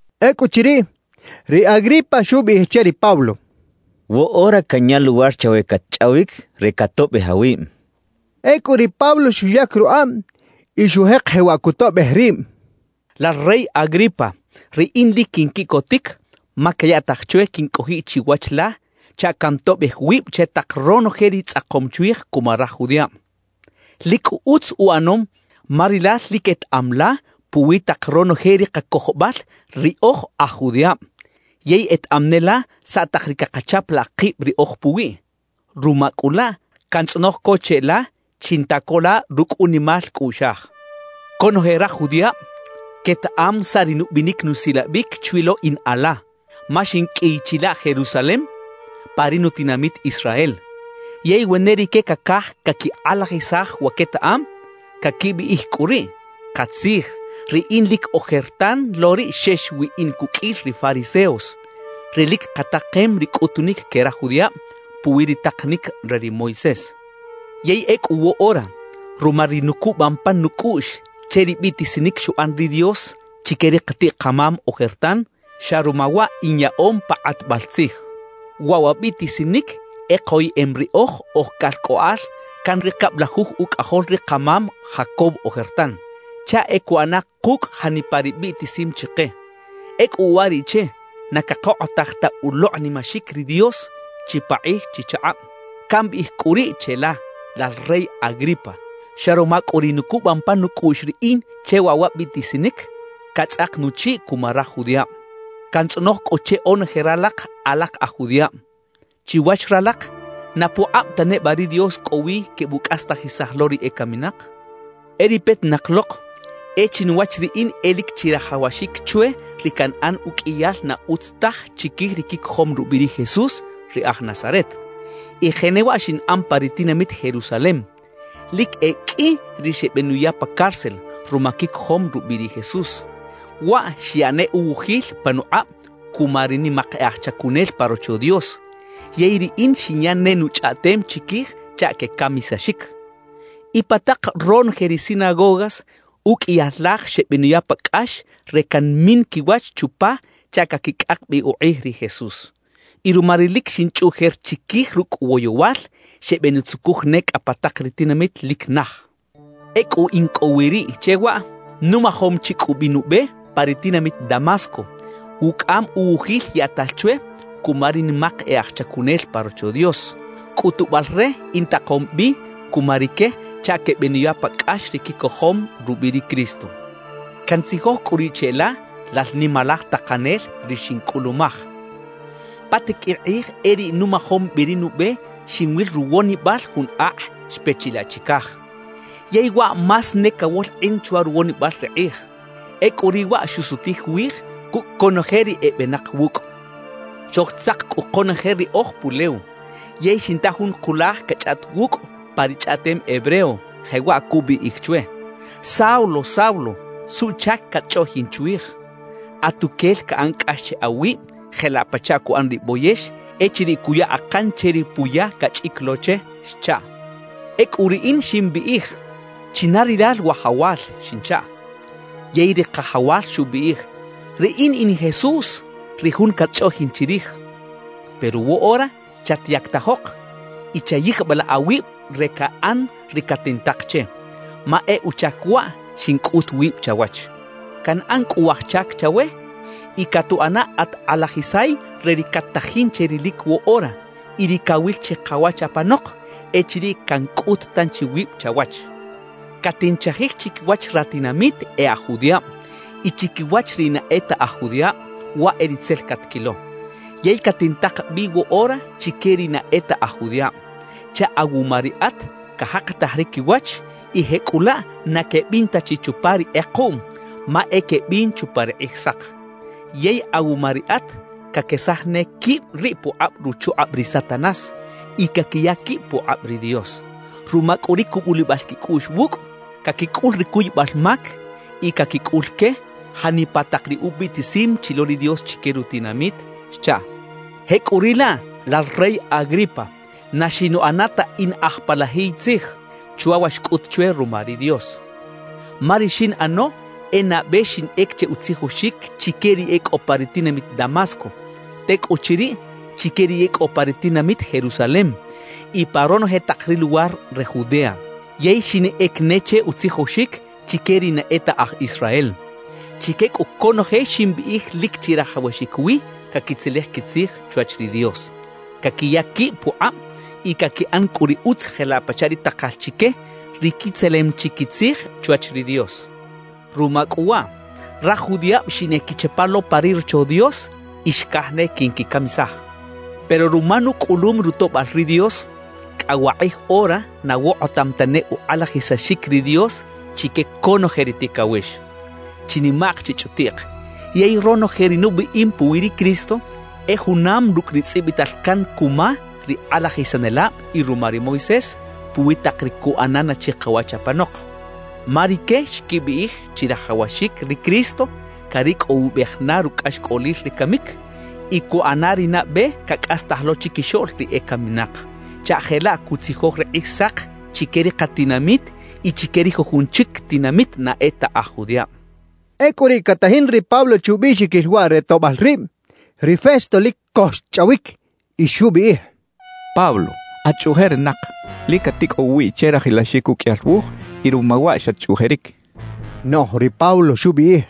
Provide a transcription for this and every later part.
Ecꞌuchiriꞌ, ri Agripa xubiꞌij che ri Pablo: «Woꞌora canya luwar chawe catchꞌawic re catoꞌbej awib» xchaꞌ. Ecꞌu ri Pablo xuyac rukꞌab y xujek jewaꞌ cutoꞌbej rib: «Lal rey Agripa, riꞌin lic quinquiꞌcotic ma cayaꞌtaj chwe quincꞌojiꞌ chiwach la chaꞌ cantoꞌbej wib che tak ronoje ri tzꞌakom chwij cuma raj judiꞌab. Lic cꞌu utz uꞌanom, ma rilal lic etaꞌam la puwi tak ronoje ri kacojobal ri oj aj judiꞌab yey etaꞌam ne la saꞌ tak ri cakachapalaꞌ kib riꞌoj puwiꞌ. Ruma cꞌu laꞌ, cantzꞌonoj co cheꞌla, chinta co la rucꞌ unimal cꞌuꞌxaj. »Conoje raj judiꞌab quetaꞌam saꞌ ri nubinic nusilabic chwi lo in ala, ma xinqꞌuiy chilaꞌ Jerusalem pa ri nutinamit Israel. Yey we ne rique cacaj caquikꞌalajisaj wa quetaꞌam, caquibiꞌij cꞌu riꞌ, katzij, riꞌin lic ojertan lo riꞌ xex wi in cuqꞌuil ri fariseos, ri lic katakem ri cꞌutunic que raj judiꞌab puwi ri takanic re ri Moisés. »Yey ecꞌu woꞌora, ruma ri nucubam pan nucꞌuꞌx che ri biꞌtisinic xuꞌan ri Dios chique ri katiꞌ-kamam ojertan, xa ruma waꞌ inyaꞌom pa kꞌatbal tzij. Waꞌ wa biꞌtisinic e koyeꞌem riꞌoj oj calcꞌoꞌal can ri cablajuj ucꞌajol ri kamam Jacob ojertan, chaꞌ e cuꞌana kucꞌ janipa ri biꞌtisim chike. Ecꞌu uwariꞌche na cakokꞌotaj ta ulokꞌnimaxic ri Dios chipakꞌij chichakꞌab. Cambiꞌij cꞌu riꞌ cheꞌla, lal rey Agripa: Xa ruma cꞌu ri nucubam pan nucꞌuꞌx riꞌin che waꞌ wa biꞌtisinic, catzꞌak nuchiꞌ cuma raj judiꞌab. Cantzꞌonoj cꞌu che onoje ralak alak aj judiꞌab: Chiwach ralak, ¿na pukꞌab ta neba ri Dios cꞌo wi quebucꞌastajisaj lo ri ecaminak? »E ri petinak lok, e chinuwach riꞌin e lic chirajawaxic chwe ri canꞌan uqꞌuiyal na utz taj chiquij ri quicojom rubiꞌ ri Jesús ri aj Nazaret. Y jenewaꞌ xinꞌan pa ri tinamit Jerusalem. Lic e qꞌui ri xebenuya pa cárcel ruma quicojom rubiꞌ ri Jesús. Waꞌ xyaꞌ ne uwujil panukꞌab cuma ri nimak e aj chacunel pa Rocho Dios. Yey riꞌin xinya ne nuchꞌaꞌtem chiquij chaꞌ quecamisaxic. Y pa tak ronoje ri sinagogas uqꞌuiyal laj xebenuya pa cꞌax re canmin quiwach chupa chaꞌ caquicꞌak bi ukꞌij ri Jesús. Y ruma ri lic xinchꞌuꞌjer chiquij rucꞌ woyowal, xebeꞌnutzucuj ne cꞌa pa tak ri tinamit lic naj. »Ecꞌu in cꞌo wi riꞌ che waꞌ, numajom chi cꞌu bi nube pa ri tinamit Damasco, wucꞌam uwujil yaꞌtal chwe cuma ri nimak e aj chacunel pa Rocho Dios cꞌutubal re intakom bi cuma rique chaꞌ quebenuya pa cꞌax ri quicojom rubiꞌ ri Cristo. Cantzijoj cꞌu riꞌ cheꞌla, lal nimalaj takanel, ri xincꞌulumaj: Pa tiqꞌuil kꞌij e riꞌ numajom bi ri nube, xinwil ruwonibal jun akꞌ xpe chilaꞌ chicaj. Yey waꞌ más ne cawolkꞌin chwa ruwonibal ri kꞌij; ecꞌu riꞌ waꞌ xusutij wij cucꞌ conoje ri ebenak wucꞌ. Xojtzak cꞌu konoje riꞌoj pulew, yey xinta jun kulaj cachꞌaꞌt wucꞌ pa ri chꞌaꞌtem hebreo, jewaꞌ cubiꞌij chwe: “Saulo, Saulo, ¿suꞌchac catchꞌoꞌjin chwij? Atuquel caꞌan cꞌax che awib jelaꞌ pachaꞌ cuꞌan ri boyex echiriꞌ cuya akan che ri puya cachꞌic lo che” xchaꞌ. »Ecꞌu riꞌin ximbiꞌij: “¿China rilal, Wajawal?” xinchaꞌ. »Yey ri Kajawal xubiꞌij: “Riꞌin in Jesús, ri jun catchꞌoꞌjin chirij. Pero woꞌora chatyactajok y chayijbilaꞌ awib re caꞌan ri catintak che, ma e uchac waꞌ xincꞌut wib chawach. Canꞌan cꞌu waj chac chawe y catuꞌana at kꞌalajisay re ri cat-tajin che rilic woꞌora y ri cawil chikawach apanok echiriꞌ cancꞌut tanchi wib chawach. Catinchajij chiquiwach ratinamit e aj judiꞌab y chiquiwach ri na e ta aj judiꞌab, waꞌ e ri tzel catquilo. Yey catintak bi woꞌora chique ri na e ta aj judiꞌab chaꞌ awuma riꞌat cajakataj ri quiwach y jecꞌulaꞌ na quebin ta chi chupa ri kꞌekuꞌm, ma e quebin chupa ri Kꞌijsak. Yey awuma riꞌat caquesaj ne quib riꞌ pukꞌab ruchukꞌab ri Satanás y caquiya quib pukꞌab ri Dios. Ruma cꞌu ri cubulibal quicꞌuꞌx wucꞌ, caquicꞌul ri cuybal mac y caquicꞌul que janipa tak ri ubiꞌtisim chi lo ri Dios chique rutinamit” xchaꞌ. »Jecꞌuriꞌlaꞌ, lal rey Agripa, na xinuꞌana ta in aj palajiy tzij chwa wa xcꞌut chwe ruma ri Dios. Ma ri xinꞌano e nabe xinꞌec che utzijoxic chique ri e cꞌo pa ri tinamit Damasco, tecꞌuchiriꞌ chique ri e cꞌo pa ri tinamit Jerusalem y pa ronoje tak ri luwar re Judea. Yey xinꞌec ne che utzijoxic chique ri na e ta aj Israel. Chique cꞌu conoje ximbiꞌij lic chirajawaxic wi caquitzelej quitzij chwach ri Dios, caquiya quib pukꞌab y caquiꞌan cꞌu ri utz jelaꞌ pachaꞌ ri takal chique ri quitzelem chi quitzij chwach ri Dios. »Ruma cꞌu waꞌ, raj judiꞌab xineꞌquichapa lo pa ri Rocho Dios y xcaj ne quinquicamisaj. Pero ruma nucꞌulum rutoꞌbal ri Dios, cꞌa wakꞌij ora na wokꞌotam ta ne ukꞌalajisaxic ri Dios chique conoje ri ticawex, chinimaꞌk chichꞌutiꞌk. Yey ronoje ri nubiꞌim puwi ri Cristo e junam rucꞌ ri tzꞌibital can cuma ri kꞌalajisanelab y ruma ri Moisés puwi tak ri cuꞌana na chikawach apanok. Ma rique xquibiꞌij chirajawaxic ri Cristo caricꞌowibej na rucꞌaxcꞌolil ri camic y cuꞌana ri nabe cacꞌastaj lo chiquixoꞌl ri ecaminak, chaꞌ jelaꞌ cutzijoj ri Kꞌijsak chique ri katinamit y chique ri jujun chic tinamit na e ta aj judiꞌab.» Ecꞌu riꞌ catajin ri Pablo che ubiꞌxiquil waꞌ re toꞌbal rib, ri Festo lic co xchꞌawic y xubiꞌij: —Pablo, ¡at chꞌuꞌjerinak! Lic caticꞌow uwiꞌ che rajilaxic uqꞌuiyal wuj, y ruma waꞌ xatchꞌuꞌjeric —xchaꞌ. Noꞌj ri Pablo xubiꞌij: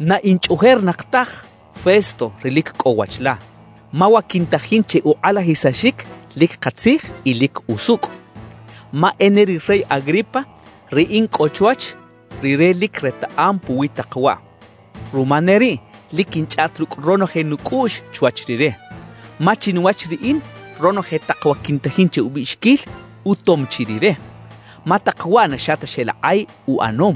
—Na in chꞌuꞌjerinak taj, Festo, ri lic cꞌo wach la. Ma wa quintajin che ukꞌalajisaxic lic katzij y lic usucꞌ. Ma e ne ri rey Agripa, ri in cꞌo chwach, rire lic retaꞌam puwi tak waꞌ. Ruma ne riꞌ, lic quinchꞌaꞌt rucꞌ ronoje nucꞌuꞌx chwach rire. Ma chinuwach riꞌin, ronoje tak wa quintajin che ubiꞌxiquil, utom chi rire; ma tak waꞌ na xa ta xeꞌlakꞌay uꞌanom.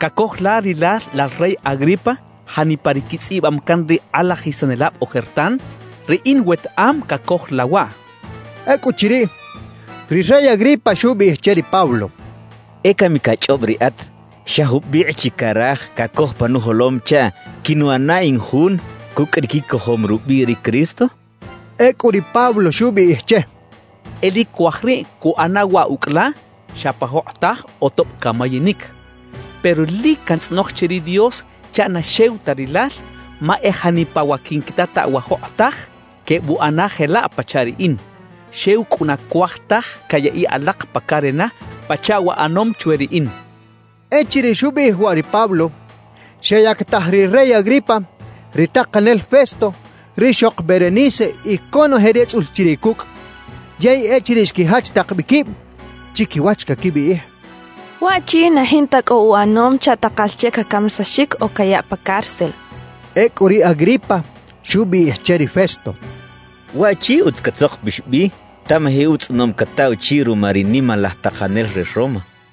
¿Cacoj la rilal lal rey Agripa, janipa ri quitzꞌibam can ri kꞌalajisanelab ojertan? ¡Riꞌin wetaꞌam cacoj la waꞌ! —xchaꞌ. Ecꞌuchiriꞌ, ri rey Agripa xubiꞌij che ri Pablo: —E cami cachꞌob riꞌat, ¿xa jubikꞌ chi caraj cacoj pa nujolom chaꞌ quinuꞌana in jun cucꞌ ri quicojom rubiꞌ ri Cristo? —xchaꞌ. Ecꞌu ri Pablo xubiꞌij che: —E lic cuaj riꞌ cuꞌana waꞌ ucꞌ la, xa pa jokꞌotaj o tob camayinic; pero ¡lic cantzꞌonoj che ri Dios chaꞌ na xew ta rilal, ma e janipa wa quinquitataꞌ wa jokꞌotaj, quebuꞌana jelaꞌ pachaꞌ riꞌin! Xew cꞌu na cuaj taj cayaꞌiꞌ alak pa carena pachaꞌ wa ꞌanom chwe riꞌin —xchaꞌ. Echiriꞌ xubiꞌij waꞌ ri Pablo, xeyactaj ri rey Agripa, ri takanel Festo, rixok Berenice y conoje ri etzꞌul chiriꞌ cucꞌ. Yey echiriꞌ xquijach tak bi quib, chiquiwach caquibiꞌij: «Waꞌchi, na jinta cꞌo uꞌanom chaꞌ takal che cacamisaxic o cayaꞌ pa cárcel» quechaꞌ. Ecꞌu ri Agripa xubiꞌij che ri Festo: —Waꞌchi, utz catzokpix bi tamaji utzꞌonom cataꞌ uchiꞌ ruma ri nimalaj takanel re Roma —xchaꞌ.